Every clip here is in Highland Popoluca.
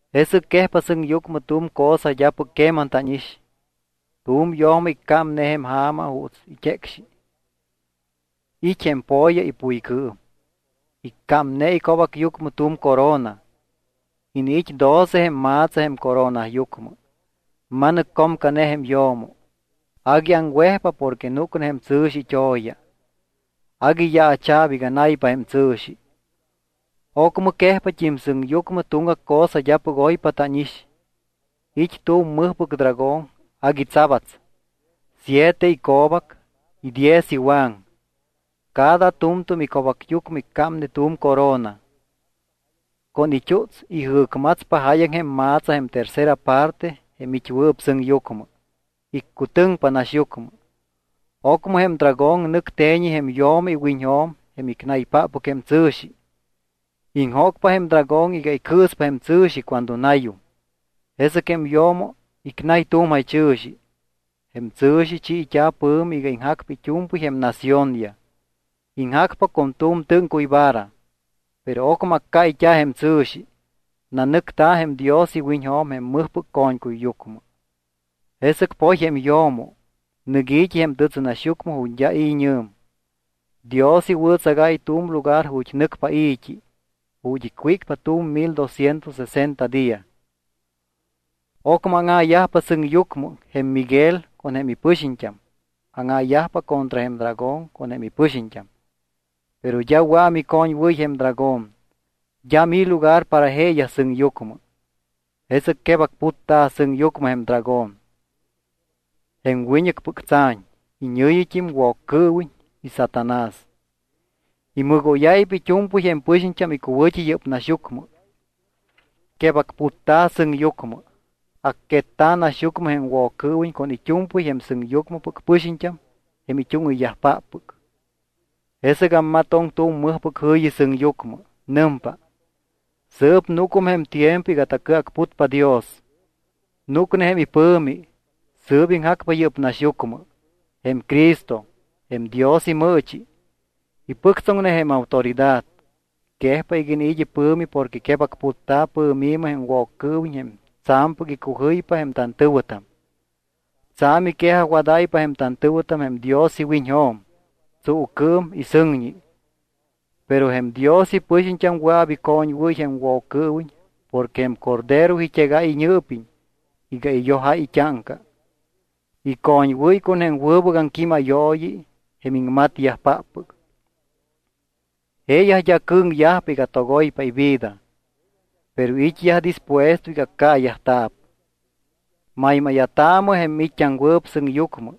Jesɨc quejpa sɨŋyucmɨ tu̱m cosa d́apɨc queman tánix. Tu̱m yo̱mo iccámne jém ja̱ma juuts it́ecxi. It́ jém po̱ya ipuycɨɨm. Iccámne ico̱bacyucmɨ tu̱m corona, iniit́ doce jém ma̱tsa jém coronayucmɨ. Ma̱nɨccomcane jém yo̱mo. Agui aŋwejpa porque núcne jém tsɨ̱xi it́o̱ya. Agui yaacha̱p iga naypa jém tsɨ̱xi. Ocmɨ quejpat́im sɨŋyucmɨ tuŋgac cosa d́apɨc oypa tánix. It́ tu̱m mɨjpɨc dragón agui tsabats. Siete ico̱bac y diez iwaŋ. Cada tu̱mtu̱m ico̱bacyucmɨ iccámne tu̱m corona. Con it́uts ijɨ̱cmatspa jáyaŋ jém ma̱tsa jém tercera parte jém it́wɨɨp sɨŋyucmɨ. Iccutɨŋpa naxyucmɨ. Ocmɨ jém dragón nɨc te̱ñi jém yo̱mo iwiñjo̱m jém icnaypáppɨc jém tsɨ̱xi. Iŋjócpa jém dragón iga icɨɨspa jém tsɨ̱xi cuando nayum. Jesɨc jém yo̱mo icnay tu̱m jaychɨ̱xi. Jém tsɨ̱xi chiit́a̱ pɨ̱mi iga iŋjacpa it́u̱mpɨy jém naciónyaj. Iŋjacpa con tu̱m tɨ́ŋcuy vara. Pero ocmɨ accáyt́a̱ jém tsɨ̱xi, nanɨcta̱ jém Dios iwiñjo̱m jém mɨjpɨc co̱ñcuyyucmɨ. Jesɨc poy jém yo̱mo, nɨc i̱t́i jém tɨtsɨnaxyucmɨ ju̱t́ d́a i̱ñɨ̱m. Dios iwɨ̱tsagáy tu̱m lugar ju̱t́ nɨcpa i̱t́i, ju̱t́ icwícpa tu̱m mil dosciento sesenta día. Ocmɨ áŋa̱yajpa sɨŋyucmɨ. Jém Miguel con jém ipɨxiñt́am áŋa̱yajpa contra jém dragón con jém ipɨxiñt́am. Pero d́a wɨa̱ micoñwɨ́y jém dragón. D́am i̱ lugar para jeeyaj sɨŋyucmɨ. Jesɨc quebacputta̱ sɨŋyucmɨ jém dragón, jém wiñɨcpɨc tsa̱ñ. Iñɨ̱yit́im Woccɨɨwiñ y Satanás. Imɨgóyáypa it́u̱mpɨy jém pɨxiñt́am icuwɨ̱t́i yɨ́p naxyucmɨ. Quebacputta̱ sɨŋyucmɨ, acquetta̱ naxyucmɨ jém Woccɨɨwiñ con it́u̱mpɨy jém sɨŋyucmɨpɨc pɨxiñt́am jém it́úŋɨyyajpáppɨc. Jesɨc ammatoŋ tu̱m mɨjpɨc jɨ̱yi sɨŋyucmɨ. Nɨmpa: —Sɨɨp núcum jém tiempo iga tacɨacputpa Dios. Núcne jém ipɨ̱mi. Sɨɨp iŋjacpa yɨ́p naxyucmɨ. Jém Cristo, jém Dios imɨɨchi, ipɨctsoŋne jém autoridad. Quejpa iga iniit́ ipɨ̱mi porque quebacputta̱ pɨ̱mi̱mɨ jém Woccɨɨwiñ jém tsa̱mpɨc icujɨypa jém tantɨ̱wɨtam. Tsa̱m iquejajwadáypa jém tantɨ̱wɨtam jém Dios iwiñjo̱m tsuucɨɨm y sɨŋñi. Pero jém Dios ipɨxiñt́am wɨa̱p icoñwɨ́y jém Woccɨɨwiñ porque jém Cordero it́egáy iñɨɨpiñ iga iyojáy it́áŋca. Icoñwɨ́y con jém wɨbɨc aŋquímayooyi jém iŋmatyajpáppɨc. Jeeyaj d́a cɨ̱ŋyajpa iga togoypa ivida, pero it́yaj dispuesto iga accaayajta̱p. Maymáya̱taamɨ jém miit́t́aŋwɨɨp sɨŋyucmɨ.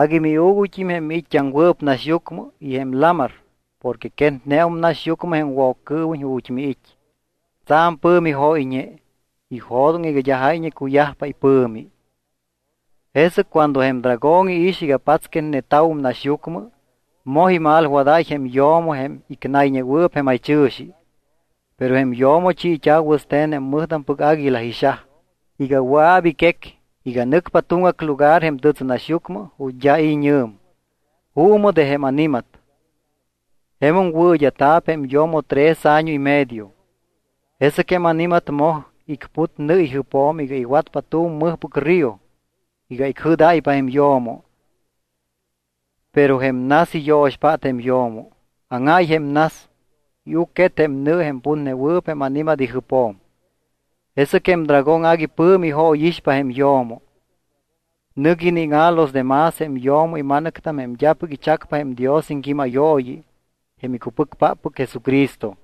Agui miuuguyt́im jém miit́t́aŋwɨɨp naxyucmɨ y jém lamar porque quetneum naxyucmɨ jém Woccɨɨwiñ ju̱t́ miit́. Tsa̱m pɨ̱mi jóyñe. Ijo̱doŋ iga d́a jáyñe cuyajpa ipɨ̱mi. Jesɨc cuando jém dragón iix iga patsquetneta̱wum naxyucmɨ, moj imalwadáy jém yo̱mo jém icnayñewɨɨp jém jaychɨ̱xi. Pero jém yo̱mo chiit́a̱ wɨste̱n jém mɨjtampɨc águila ixaj iga wɨa̱p iquec iga nɨcpa tuŋgac lugar jém tɨtsɨnaxyucmɨ ju̱t́ d́a i̱ñɨ̱m, juumɨ de jém ani̱mat. Jemum wɨɨd́a̱ta̱p jém yo̱mo tres año y medio. Jesɨc jém ani̱mat moj icput nɨ ijɨpjo̱m iga iwatpa tu̱m mɨjpɨc río iga icjɨ́dáypa jém yo̱mo. Pero jém nas iyo̱xpát jém yo̱mo. Áŋáy jém nas, iucquet jém nɨ jém putnewɨɨp jém ani̱mat ijɨpjo̱m. Jesɨc jém dragón agui pɨ̱mi ijóyixpa jém yo̱mo. Nɨc iníŋa̱ los de más jém yo̱mo ima̱nɨctam jém d́apɨc ichacpa jém Dios iŋquímayooyi jém icupɨcpáppɨc Jesucristo.